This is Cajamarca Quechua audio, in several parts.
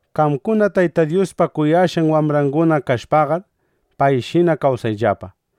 Qamkuna Tayta Dyuspa kuyashqan wambranguna kashpaqar, payshina kawsayllapa.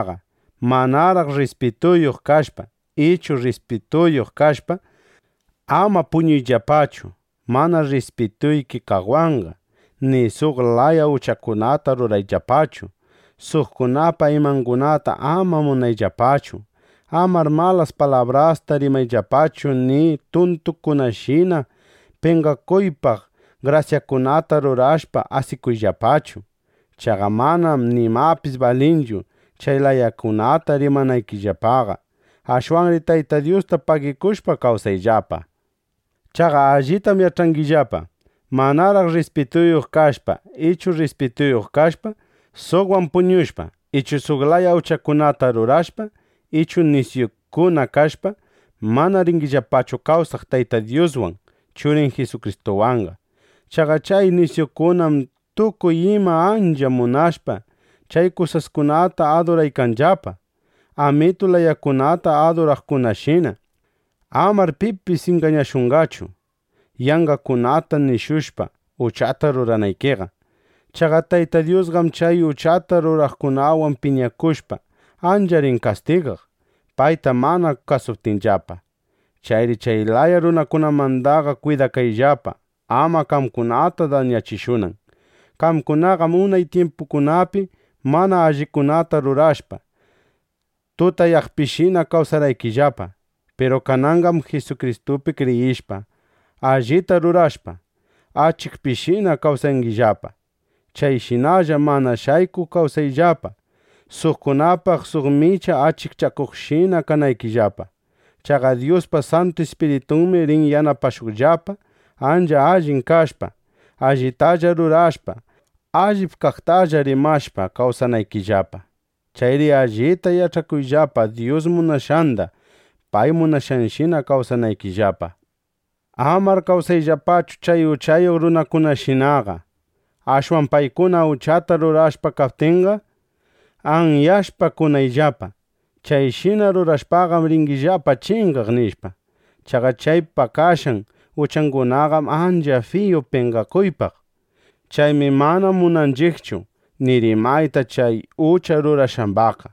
Chayri Tayta Dyuspa wambranguna kashpaqa, manaraq rrispituyuq kashpa ichu rrispituyuq kashpa, ama puñuyllapachu mana rrispituyki kaqwanqa, ni suq laya uchakunata rurayllapachu. Suqkunapa imangunata ama munakuyllapachu. Amar malas palabrasta rimayllapachu ni tuntukunashina penqakuypaq grasyakunata rurashpa asikuyllapachu. Chaqa manam nimapis balinchu chay layakunata rimanaykillapaqa. Ashwanri Tayta Dyusta pagikushpa, kawsayllapa. Chaqa allitam yach'angillapa: Manaraq rrispituyuq kashpa ichu rrispituyuq kashpa, suqwan puñushpa ichu suq laya uchakunata rurashpa ichu nisyukuna kashpa, mana ringillapachu kawsaq Tayta Dyuswan Churin Jisukristuwanqa. Chaqa chay nisyukunam tukuy imata ancha munashpa, chay kusaskunata aduraykanllapa, amitu layakunata aduraqkunashina. Amar pipis ingañashunqachu, yanqakunata nishushpa, uchata ruranaykiqa. Chaqa Tayta Dyusqam chay uchata ruraqkunawan piñakushpa, ancha rin kastigaq, payta mana kasuptinllapa. Chayri chay laya runakunamandaqa kwidakayllapa, ama qamkunata dañachishunan. Qamkunaqam unay tyimpukunapi mana allikunata rurashpa, tutayaqpishina kawsarqaykillapa. Piru kananqam Jisukristupi kriyishpa, allita rurashpa, achikpishinana kawsangillapa. Chayshinalla mana shaykuq kawsayllapa, suqkunapaq suq micha achikchakuqshina kanaykillapa. Chaqa Dyuspa Santu Ispiritunmi rin yanapashuqllapa, ancha allin kashpa, allitalla rurashpa, allip kaqtalla rimashpa kawsanaykillapa. Chayri allita yach'akuyllapa Dyus munashqanda, pay munashqanshina kawsanaykillapa. Amar kawsayllapachu chay uchayuq runakunashinaqa. Ashwan paykuna uchata rurashpa pakaptinqa, anyashpa kunayllapa: “Chayshina rurashpaqam, ringillapa chingaq”, nishpa. Chaqa chay pakashqan uchangunaqam ancha fiyu penqakuypaq. Chaymi mana munanchiqchu ni rimayta chay ucha rurashqambaqqa.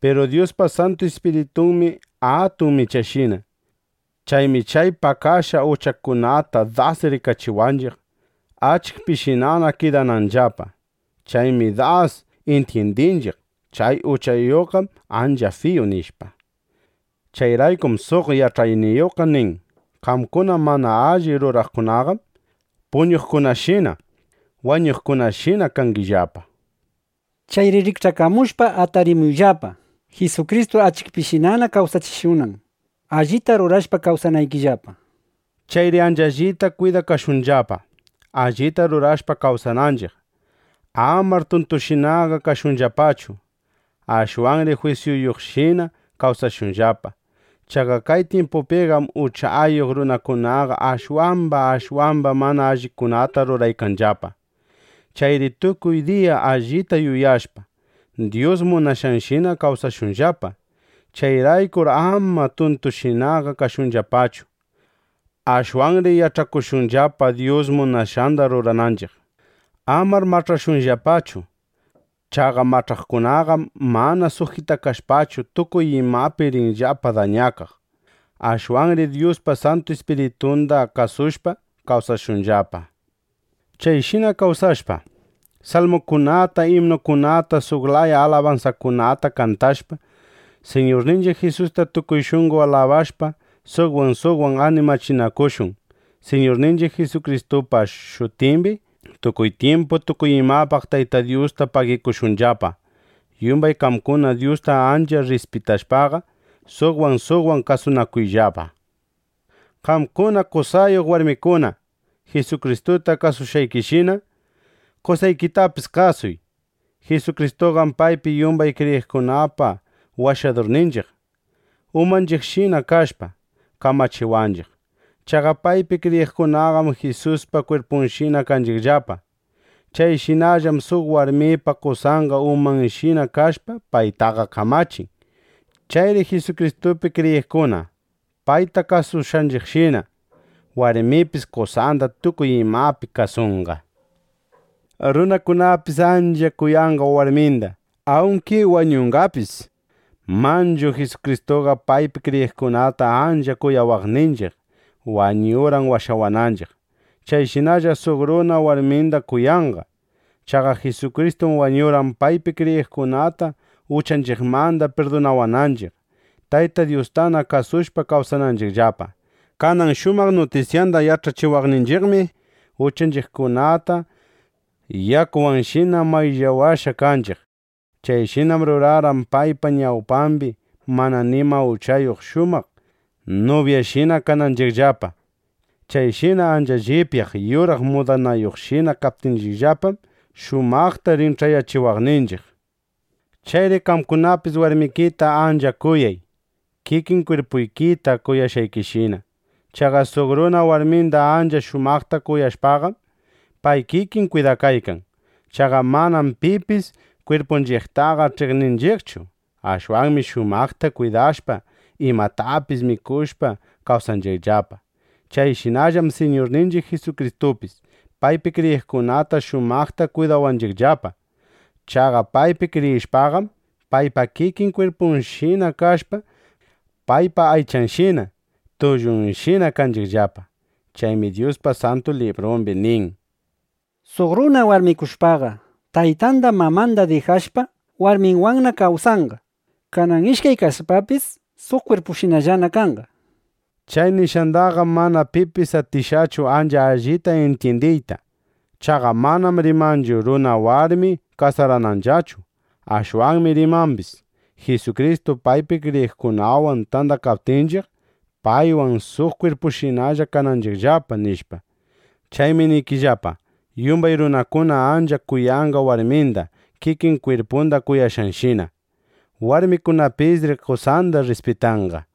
(Piru Dyuspa Santu Ispiritunmi atun michashina.) Chaymi chay pakashqa uchakunata das rikachiwanchiq, achikpishinana kidananllapa. Chaymi das intyindinchiq: Chay uchakunaqam ancha fiyu, nishpa. Chayraykum suq yach'ayniyuqqa nin: Qamkuna mana alli ruraqkunaqam puñuqkunashina, wañuqkunashina kangillapa. Chayri rikch'akamushpa, atarimuyllapa, Jisukristu achikpishinana kawsachishunan, allitana rurashpa kawsanaykillapa, nishpa. Chayri ancha allita kwidakashunllapa, allita rurashpa kawsananchiq. Amar tuntushinaqa kashunllapachu. Ashwanri jwisyuyuqshina kawsashunllapa. Chaqa kay tyimpupiqam uchayuq runakunaqa ashwamba ashwamba mana allikunata ruraykanllapa. Chayri tukuy diya allita yuyashpa, Dyus munashqanshina kawsashunllapa. Chayraykur ama tuntushinaqa kashunllapachu. Ashwanri yach'akushunllapa Dyus munashqanda rurananchiq. Amar mach'ashunllapachu. Chaqa mach'ashqakunaqam mana sujitakashpachu, tukuy imapi rinllapa dañakaq. Ashwanri Dyuspa Santu Ispiritunda kasushpa, kawsashunllapa. Chayshina kawsashpa, salmukunata, imnukunata, suq laya alabansakunata kantashpa, Siñurninchiq Jisusta tukuy shunqo alabashpa, suqwan suqwan animachinakushun. Siñurninchiq Jisukristupa shutimbi tukuy tyimpu, tukuy imapaq Tayta Dyusta pagikushunllapa. Yumbay qamkuna Dyusta ancha rrispitashpaqa, suqwan suqwan kasunakuyllapa. Qamkuna qosayuq warmikuna, Jisukristuta kasushqaykishina, qosaykitapis kasuy. Jisukristuqam paypi yumbay kriyiqkunapa Washadurninchiq, umanchiqshina kashpa, kamachiwanchiq. Chaqa paypi kriyiqkunaqam Jisuspa kwirpunshina kanchiqllapa. Chayshinallam suq warmipa qosanqa umanshina kashpa paytaqa kamachin. Chayri Jisukristupi kriyiqkuna payta kasushqanchiqshina, warmipis qosanda tukuy imapi kasunqa. Runakunapis ancha kuyanqa warminda, awnki wañunqapis. Manchu Jisukristuqa paypi kriyiqkunata ancha kuyawaqninchiq, wañurqan washawananchiq. Chayshinalla suq runa warminda kuyanqa. Chaqa Jisukristum wañurqan, paypi kriyiqkunata uchanchiqmanda pirdunawananchiq, Tayta Dyustana kasushpa kawsananchiqllapa. Kanan shumaq nutisyanda yach'achiwaqninchiqmi, uchanchiqkunata yakuwanshina mayllawashqa kanchiq. Chayshinam rurarqan, paypa ñawpambi mana nima uchayuq shumaq nubyashina kananchiqllapa. Chayshina ancha llipyaq yuraq mudanayuqshina kaptinchiqllapam, shumaqta rin ch'ayachiwaqninchiq. Chayri qamkunapis warmikita ancha kuyay, kikin kwirpuykita kuyashqaykishina. Chaqa suq runa warminda ancha shumaqta kwidashpaqam, pay kikin kwidakaykan. Chaqa manam pipis kwirpunchiqtaqa ch'iqninchiqchu. Ashwanmi shumaqta kwidashpa, imatapis mikushpa kawsanchiqllapa. Chayshinallam Siñurninchiq Jisukristupis paypi kriyiqkunata shumaqta kwidawanchiqllapa. Chaqa paypi kriyishpaqam, paypa kikin kwirpunshinana kashpa, paypa aychanshina, tullunshina kanchiqllapa. Chaymi Dyuspa Santu Librumbi nin: “Suq runa warmikushpaqa, taytanda, mamanda dijashpa, warminwanna kawsanqa. Kanan ishkay kashpapis, suq kwirpushinallana kanqa”, nishpa. Chay nishqandaqam mana pipis atishqachu ancha allita intyindiyta. Chaqa manam rimanchu runa warmi kasarananllachu. Ashwanmi rimambis, Jisukristu paypi kriyiqkunawan tandakaptinchiq, paywan suq kwirpushinallana kananchiqllapa, nishpa. Chaymi niykillapa: Yumbay runakuna ancha kuyanqa warminda kikin kwirpunda kuyashqanshina. Warmikunapisri qosanda rrispitanqa.